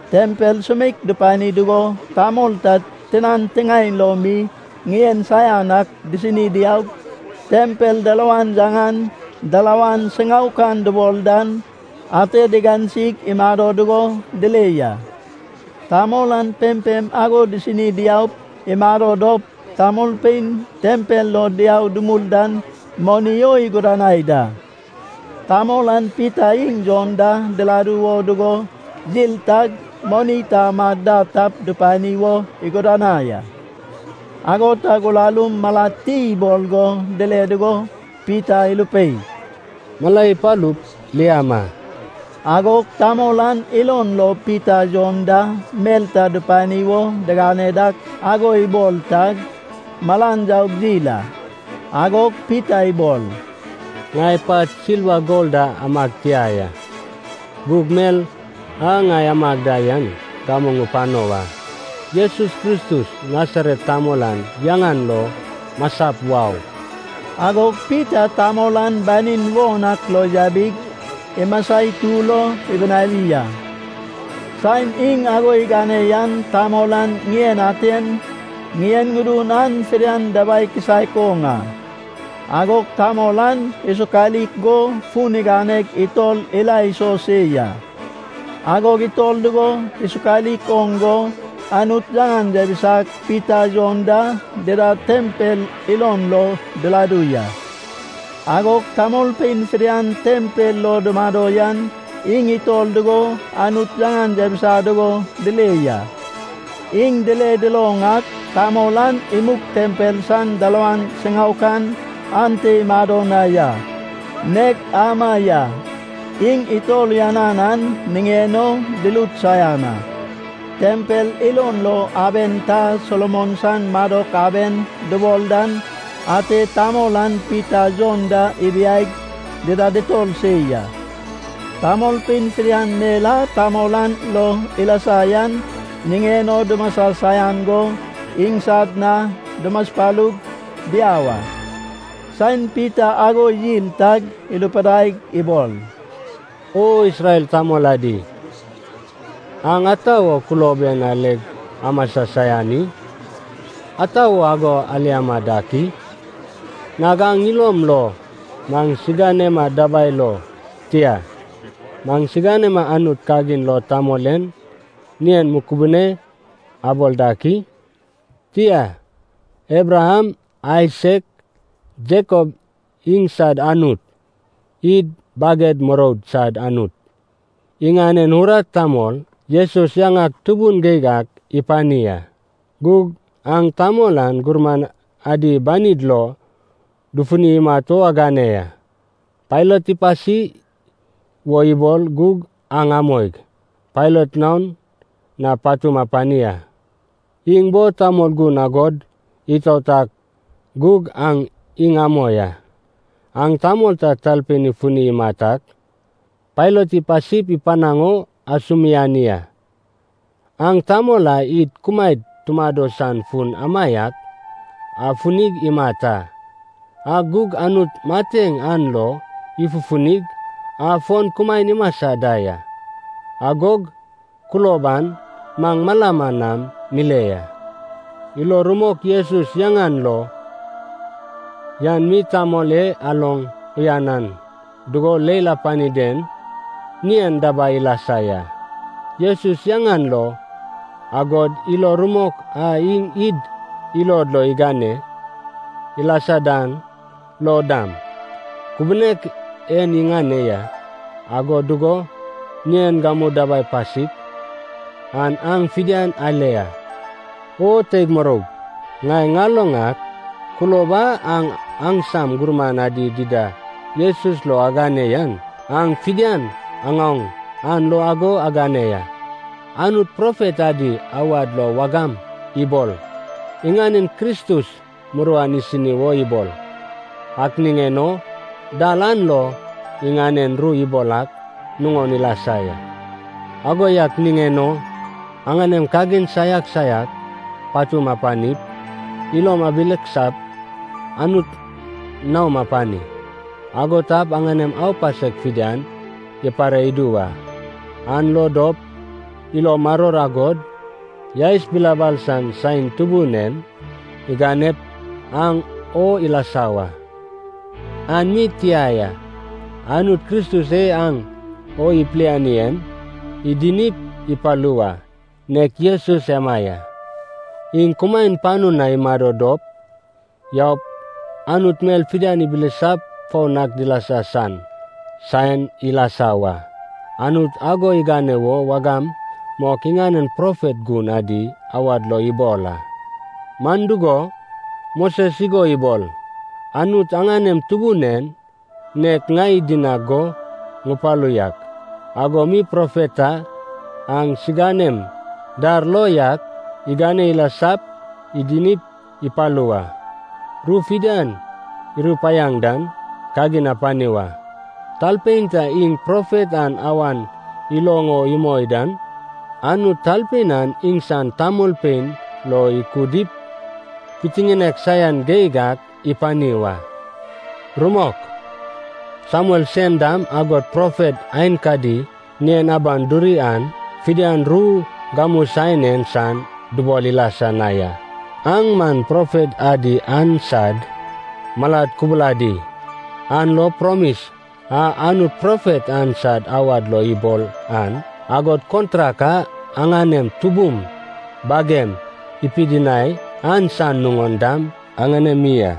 Tempel sumeik dupani dugo tamol ta tinan tiŋaen lo mi ŋien saian ak disini diaug, tempel dalawan yaŋan “Dalawan Siŋaokan” dubol dan, ate digansig imado dugo dile ya. Tamol an pempem ago disini diaup imado dop, tamolpein tempel lo diau dumul dan moni o igudanai da. Tamol an Pita iŋ Jon da diladu wo dugo yil tag moni ta amad da tap dupani wo igudanai a. Ago tag urarum malad ti ibol go dile dugo Pita irupei, “Mala ipalup, liama!” Agog tamol an ilon lo Pita Jon da mel ta dupani wo digane dak ago ibol tag, malan yaug yil a. Agog Pita ibol, “Ŋai pat silva gol da amag tia ya. Gug mel a ŋai amag da yan gamu ŋupano wa. Jesus Kristus Nasaret tamol an yaŋan lo masap wau.” Agog Pita tamol an banin won ak lo yabig, imasa itur o ibinawi a. Saen iŋ ago igane yan tamol an ŋien aten, ŋien ŋudun an fidian dabai kisaek oŋ a. Agog tamol an isokalik go, fun iganeg itor ila iso se ya. Agog itor dugo isokalik oŋ go, Anut yaŋan yabisag Pita Jon da dida tempel ilon lo diladu ya. Agog tamolpein fidian tempel lo dumado yan iŋ itor dugo Anut yaŋan yabisa dugo dile ya. Iŋ dile duloŋ ak, tamol an imug tempel san dalawan siŋaokan ante imado na yan nek ama ya. Iŋ itor uyanan an niŋen o dirut saian a. Tempel ilon lo aben ta Solomon san Madok Aben dubol dan ate tamol an Pita Jon da ibiaig, dida ditor se ya. Tamolpein fidian mel a tamol an lo ilasa yan niŋen o dumasa saian go iŋsad na dumaspalug diau a. Saen Pita ago yil tag irupidaig ibol, “O Isrel tamol adi, aŋ ata wo kulob en aleg amasa saian i? Ata wo ago aliama dak i? Nag aŋ ilom lo maŋsiganema dabai lo, tia, maŋsiganema Anut kagin lo tamol en ŋien mukubune abol dak i? Tia, Abraham, Aisak, Jakob iŋsad Anut, id baged muroud sad Anut, iŋanen urat tamol Jesus yaŋak tubun geig ak ipani a. Gug aŋ tamol an gurman adi banid lo dufuni imat o agane ya. Pailat ipasi wo ibol gug aŋ amoig Pailat naon na patum apani a. Iŋ bo tamol gun agod itaot ak gug aŋ iŋ amoi a. Aŋ tamol ta talpein ifuni imat ak Pailat ipasip ipanaŋ o asumiani a. Aŋ tamol a id kumaed tumado san fun amaiak afunig imat a. Ak gug Anut mateŋ an lo ifufunig, afon kumaen imasa da ya. Agog kulob an maŋ malama nam mile ya. Ilo rumok Jesus yaŋan lo yan mi tamol e aloŋ uyanan dugo leil apani den ŋien dabai ilasa ya. Jesus yaŋan lo, agod ilo rumok a iŋ id ilod lo igane ilasa dan lo dam, kubunek en iŋane ya, ago dugo ŋien gamu dabai pasik an aŋ fidian ale a.” “O teig muroug ŋai ŋaloŋ ak, kulob a aŋ aŋsam gurman adi dida Jesus lo agane yan, aŋ fidian aŋaoŋ an lo ago agane ya. Anut profet adi awad lo wagam ibol, iŋanen Kristus muruan isini wo ibol. Ak niŋen o dal an lo iŋanen ru ibol ak nuŋon ilasa ya. Ago yak niŋen o aŋanem kagin saiak saiak patum apanip, ilom ibileksap, Anut naom apani. Ago tap aŋanem aupasek fidian ipare idu wa, an lo dop ilo maror agod yaes bilabal san saen Tubun en iganep aŋ o ilasa wa. An mi tia ya, Anut Kristus e aŋ o ipiliani en idinip ipalu wa, nek Jesus ema ya. Iŋ kumaen panu na imado dop yaup, Anut mel fidian ibilisap foun ak dilasa san saen ilasa wa. Anut ago igane wo wagam mok iŋanen profet gun adi awad lo ibol a. Man dugo, Moses igo ibol, ‘Anut aŋanem Tubun en, nek ŋai idinag go ŋupalu yak ago mi profet ta aŋsiganem dar lo yak igane ilasap idinip ipalu wa. Ru fidian irupaiaŋ dan kagin apani wa. Talpein ta iŋ profet an awan iloŋ o imoi dan, Anut talpein an iŋsan tamolpein lo ikudip pitiŋinek saian geig ak ipani wa.’ “Rumok, Samuel sen dam agod profet aenkadi ŋien aban duri an fidian ru gamu saen en san dubol ilasa na ya. Aŋ man profet adi an sad malad kubuladi, an lo promis a Anut profet an sad awad lo ibol an, agod kontrak a aŋanem tubum bagem ipidinai an san nuŋon dam aŋanemi a.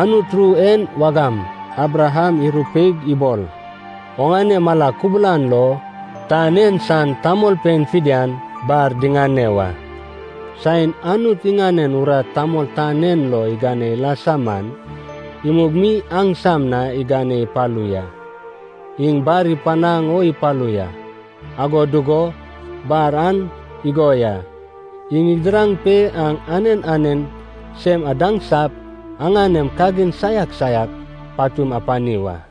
Anut ru en wagam Abraham irupeig ibol, ‘Oŋane mala kubulan lo tan en san tamolpein fidian bar diŋane wa.’ Saen Anut iŋanen urat tamol tan en lo igane ilasa man, imug mi aŋsam na igane ipalu ya. Iŋ bar ipanaŋ o ipalu ya, ago dugo bar an igo ya, iŋ idiraŋ pe aŋ anen anen sem adaŋsap aŋanem kagin saiak saiak patum apani wa.”